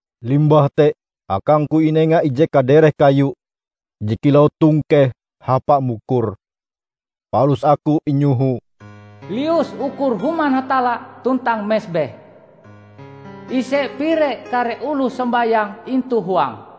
Limbah te akangku inenga ije kadereh kayu je kilau tongkeh hapa mukur, palus aku inyoho, "Lius ukur Human Hatalla tuntang mesbeh. Ise pire kare oloh sombayang intu huange.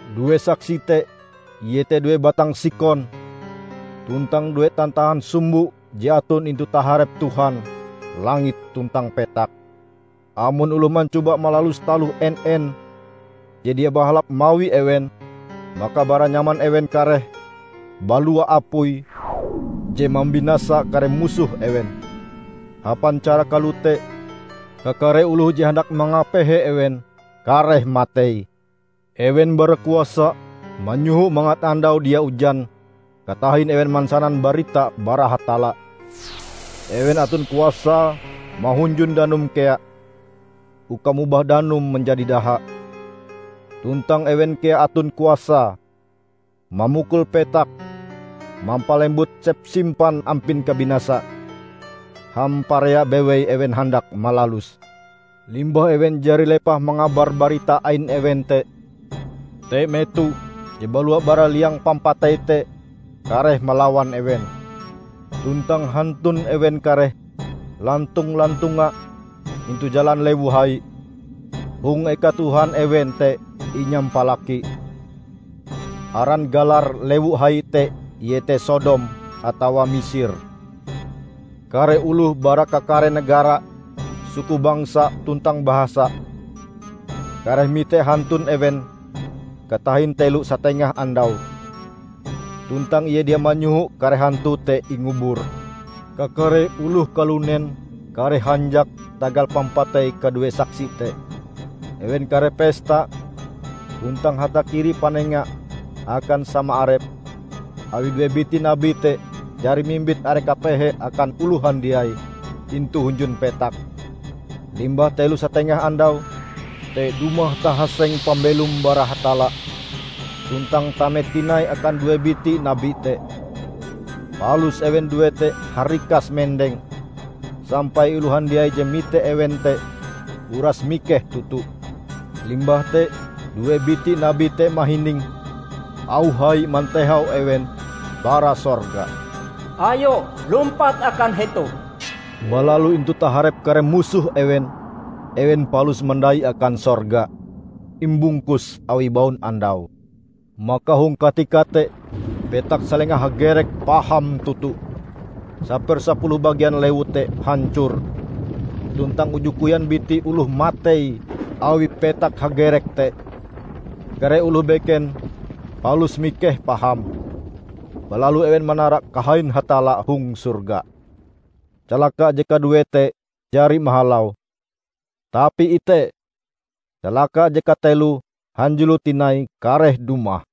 Due saksi te iete due batang sikon tuntang due tantahan sumbo je aton intu taharep Tuhan langit tuntang petak. Amon oloh mancoba malalus taloh en-en je dia bahalap mawi ewen, maka bara nyaman ewen kareh balua apui je mambinasa kare musoh ewen. Hapan cara kalote, kakare oloh je handak mangapehe ewen kareh matei. Ewen bara kuasa manyoho mangat andau dia ujan katahin ewen mansanan barita bara Hatalla. Ewen aton kuasae mahunjun danum kea, uka mobah danum manjadi daha. Tuntang ewen kea aton kuasae mamukul petak mampalembut sepsimpan ampin kabinasa, hamparea bewei ewen handak malaluse. Limbah ewen jari lepah mangabar barita ain ewen te, te meto je balua bara liang pampatei te kareh malawan ewen. Tuntang hantun ewen kareh lantong-lantonga intu jalan lewu hai, hong eka Tuhan ewen te inyampalaki. Aran galar lewu hai te iete Sodom atawa Misir. Kare oloh bara kakare negara, suku bangsa tuntang bahasa kareh mite hantun ewen katahin telo satengah andau, tuntang ie dia manyoho kare hantu te ingubur. Kakare oloh kalunen kareh hanjak tagal pampatei kadue saksi te. Ewen kareh pesta tuntang hatakiri panenga akan sama arepe awi due biti nabi te jari mimbit are kapehe akan oloh handiai intu hunjun petak. Limbah telo satengah andau, te dumah tahaseng pambelom bara Hatalla tuntang tame tinai akan due biti nabi te. Palus ewen ndue te harikas mendeng sampai oloh handiai je mite ewen te uras mikeh toto. Limbah te due biti nabi te mahining auh hai mantehau ewen bara sorga, "Ayo, lumpat akan hetoh!" Balalu intu taharep kare musoh ewen, ewen palus mandai akan sorga, imbungkus awi baunandau. Maka hong katika te petak salenga hagerek paham toto. Sapersapuluh bagian lewu te hancor, tuntang uju koyan biti oloh matei awi petak hagerek te. Kare oloh beken palus mikeh paham, balalu ewen manara kahain Hatalla hong sorga. Calaka je kaduee te jari mahalau. Tapi ite! Calaka je kateloe hanjulo tinai kareh dumah.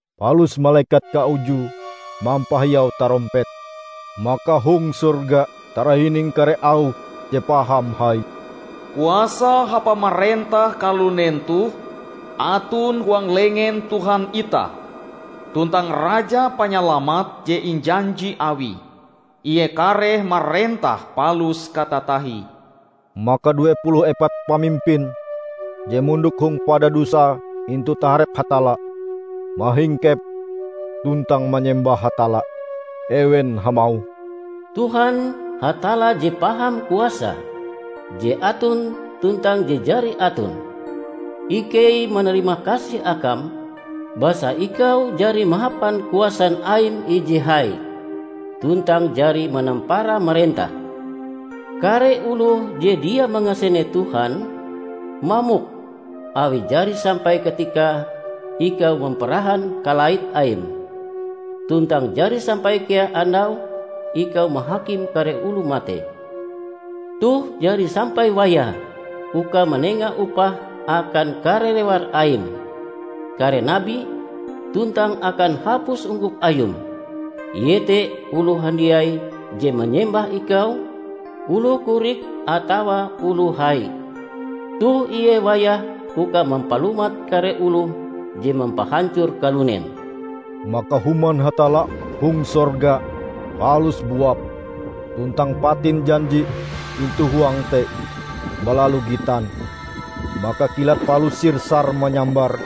Palus malekat kaujue mampahiau tarompete, maka hong sorga tarahining kare auh je paham hai, "Kuasa hapa marentah kalunen toh aton huang lengen Tuhan itah tuntang Raja Panyalamat je injanji Awie. Ie kareh marentah palus katatahie!" Maka due puluh epat pamimpin je mondok hong padadusae intu taharep Hatalla, mahingkep tuntang manyembah Hatalla. Ewen hamauh, "Tuhan, Hatalla je paham kuasae, Je Aton tuntang Je Jari Aton! Ikei manarimakasih akam basa Ikau jari mahapan kuasan Aim ije hai, tuntang jari manampara marentah! Kare oloh je dia mangasene Tuhan, mamok awi jari sampai katikae Ikau mamparahan kalait Aim, tuntang jari sampai kea andaue Ikau mahakim kare oloh matei. Toh jari sampai wayahe uka manenga upah akan kare rewar Aim, kare nabi, tuntang akan hapus ungkup Ayum, iete oloh handiai je manyembah Ikau, oloh korik atawa oloh hai. Toh ie wayahe uka mampalumat kare oloh je mampahancor kalunen!" Maka Human Hatalla hong sorga palus buap, tuntang Patin Janji intu huange te balalu gitan. Maka kilat palus sir-sar manyambar,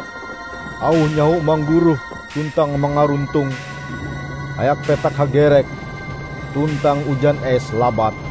auh nyaho mangguroh tuntang mangaruntong, hayak petak hagerek tuntang ujan es labat.